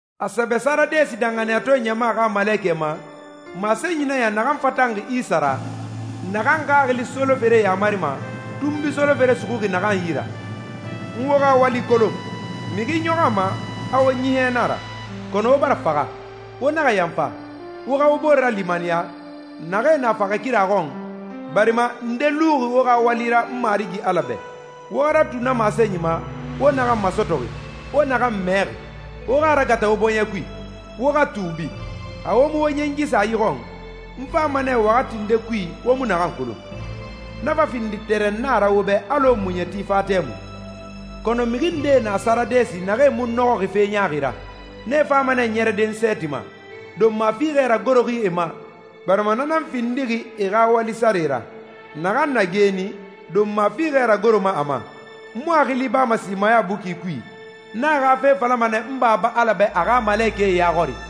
A sɛbɛ Saradesi danxaniyatɔɛ ɲama xa malekɛ ma, masenyi nan ya naxan fatanxi Isa ra, naxan Xaxili solofere yamarima, tunbui solofere suxuxi naxan yi ra: «N wo xa wali kolon. Mixi ɲɔxɔ a ma a wo ɲiɲɛ na a ra, kɔnɔ wo bara faxa. Wo naxa yanfa, wo xa wo bore ralimaniya, naxee na faxɛ kira xɔn, barima nde luxi wo xa wali ra n Marigi Ala bɛ. Wo xa ratu na masenyi ma, wo naxan masɔtɔxi, wo naxan mɛxi. Wo xa a ragata wo bɔɲɛ kui, wo xa tuubi. Xa wo mu wo ɲɛngi sa yi xɔn, n fama nɛ waxati nde kui wo mu naxan kolon, na fa findi tɛrɛnna ra wo bɛ alɔ muɲɛti fa tɛmui. Kɔnɔ mixi ndee na Saradesi naxee mu nɔxɔxi fe ɲaaxi ra. Nee fama nɛ ɲɛrɛde n sɛɛti ma, donma fiixɛ ragoroxi e ma, barima na nan findixi e xa wali sare ra.» «Naxan na geeni, donma fiixɛ ragoroma a ma. N mu a xili bama simaya buki kui, n a xa fe falama nɛ n Baba Ala bɛ a xa malekɛe ya xɔri.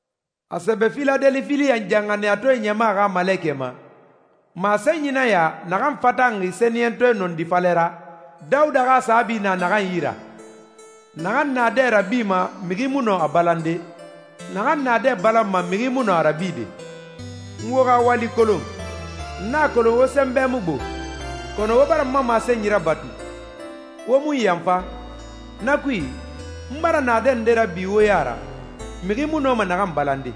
A sɛbɛ Filadelifiya danxaniyatɔɛ ɲama xa malekɛ ma, masenyi nan ya naxan fatanxi Sɛniyɛntɔɛ nɔndi falɛ ra, Dawuda xa saabi na naxan yi ra, naxan naadɛ rabima mixi mu nɔ a balande, naxan naadɛ balanma mixi mu nɔ a rabide: «N wo xa wali kolon. N a kolon wo sɛnbɛ mu gbo, kɔnɔ wo bara n ma masenyi rabatu, wo mu n yanfa. Na kui, n bara naadɛ nde rabi wo ya ra, mixi mu nɔma naxan balande.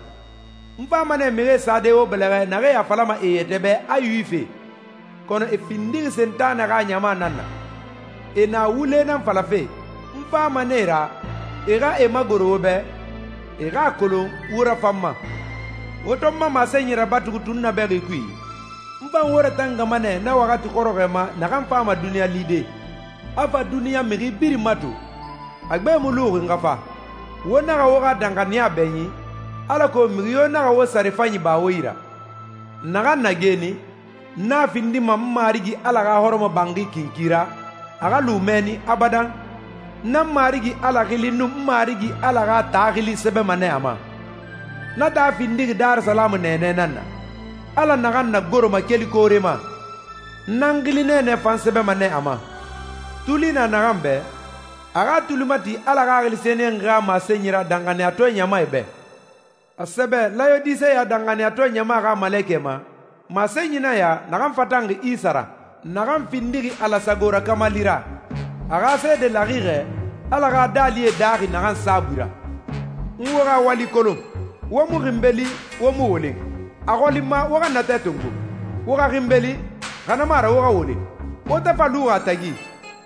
N fama nɛ mixie sade wo bɛlɛxɛ naxee a falama e yɛtɛ bɛ a Yuwifie, kɔnɔ e findixi Sentanɛ xa ɲama nan na. E na wule nan falafe. N fama nɛ e ra, e xa e magoro wo bɛ, e xa a kolon wo rafan n ma. Wo to n ma masenyi rabatu tunnabɛxi kui, n fan wo ratangama nɛ na waxati xɔrɔxɔɛ ma naxan fama duniɲa lide, a fa duniɲa mixi birin mato. A gbe mu luxi n xa fa. Wo naxa wo xa danxaniya bɛɲin, alako mixi yo naxa wo sare fanyi ba wo yi ra.» «Naxan na geeni, n a findima n Marigi Ala xa hɔrɔmɔbanxi kinki ra, a xa lu mɛnni abadan. N nan n Marigi Ala xili nun n Marigi Ala xa taa xili sɛbɛma nɛ a ma. Na taa findixi Darisalamu nɛɛnɛ nan na, Ala naxan nagoroma kelife koore ma. N nan n xili nɛɛnɛ fan sɛbɛma nɛ a ma. Tuli na naxan bɛ, a xa a tuli mati Ala Xaxili Sɛniyɛnxi xa masenyi ra danxaniyatɔɛ ɲamae bɛ.» A sɛbɛ Layodiseya danxaniyatɔɛ ɲama xa malekɛ ma, masenyi nan ya naxan fatanxi Isa ra, naxan findixi Ala sago rakamali ra, a xa seede laxixɛ, Ala xa daalie daaxi naxan saabui ra: «N wo xa wali kolon. Wo mu xinbeli, wo mu wolen. A xɔli n ma wo xa natɛ tongo, wo xa xinbeli, xa na mu a ra wo xa wolen. Wo to fa luxi a tagi,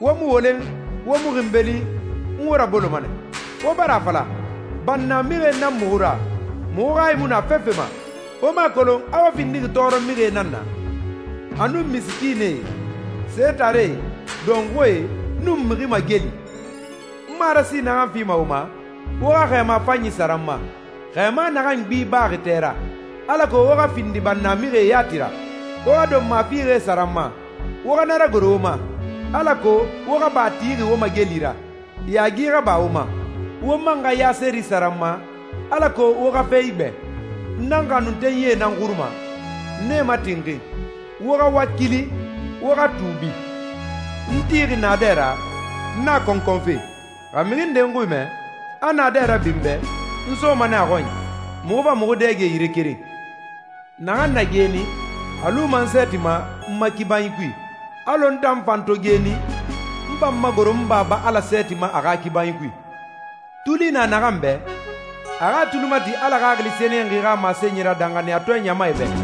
wo mu wolen, wo mu xinbeli, n wo raboloma nɛ. Wo bara a fala, ‹Bannamixie nan muxu ra, muxu hayi mu na fefe ma.› Wo mu a kolon a wo findixi tɔɔrɔmixie nan na, a nun misikiinɛe, setaree, dɔnxuie, nun mixi mageli. N marasi naxan fima wo ma, wo xa xɛɛma fanyi sara n ma, xɛɛma naxan gbi baxi tɛ ra, alako wo xa findi bannamixie yati ra. Wo xa donma fiixɛ sara n ma, wo xa na ragoro wo ma, alako wo xa ba tixi wo mageli ra, yaagi xa ba wo ma. Wo man xa ya seri sara n ma, alako wo xa fe igbɛ. N nan n xanuntenyie nan xuruma, n e matinxin. Wo xa wakili, wo xa tuubi. N tixi naadɛ ra, n na a kɔnkɔnfe. Xa mixi nde n xui mɛ, a naadɛ rabi n bɛ, n soma nɛ a xɔnyi, muxu fa muxu dɛge yire keren.» «Naxan na geeni, a luma n sɛɛti ma n ma kibanyi kui, alɔ n tan fan to geeni, n fa n magoro n Baba Ala sɛɛti ma a xa kibanyi kui. Tuli na naxan bɛ, a xa a tuli mati Ala Xaxili Sɛniyɛnxi xa masenyi ra danxaniyatɔɛ ɲamae bɛ.»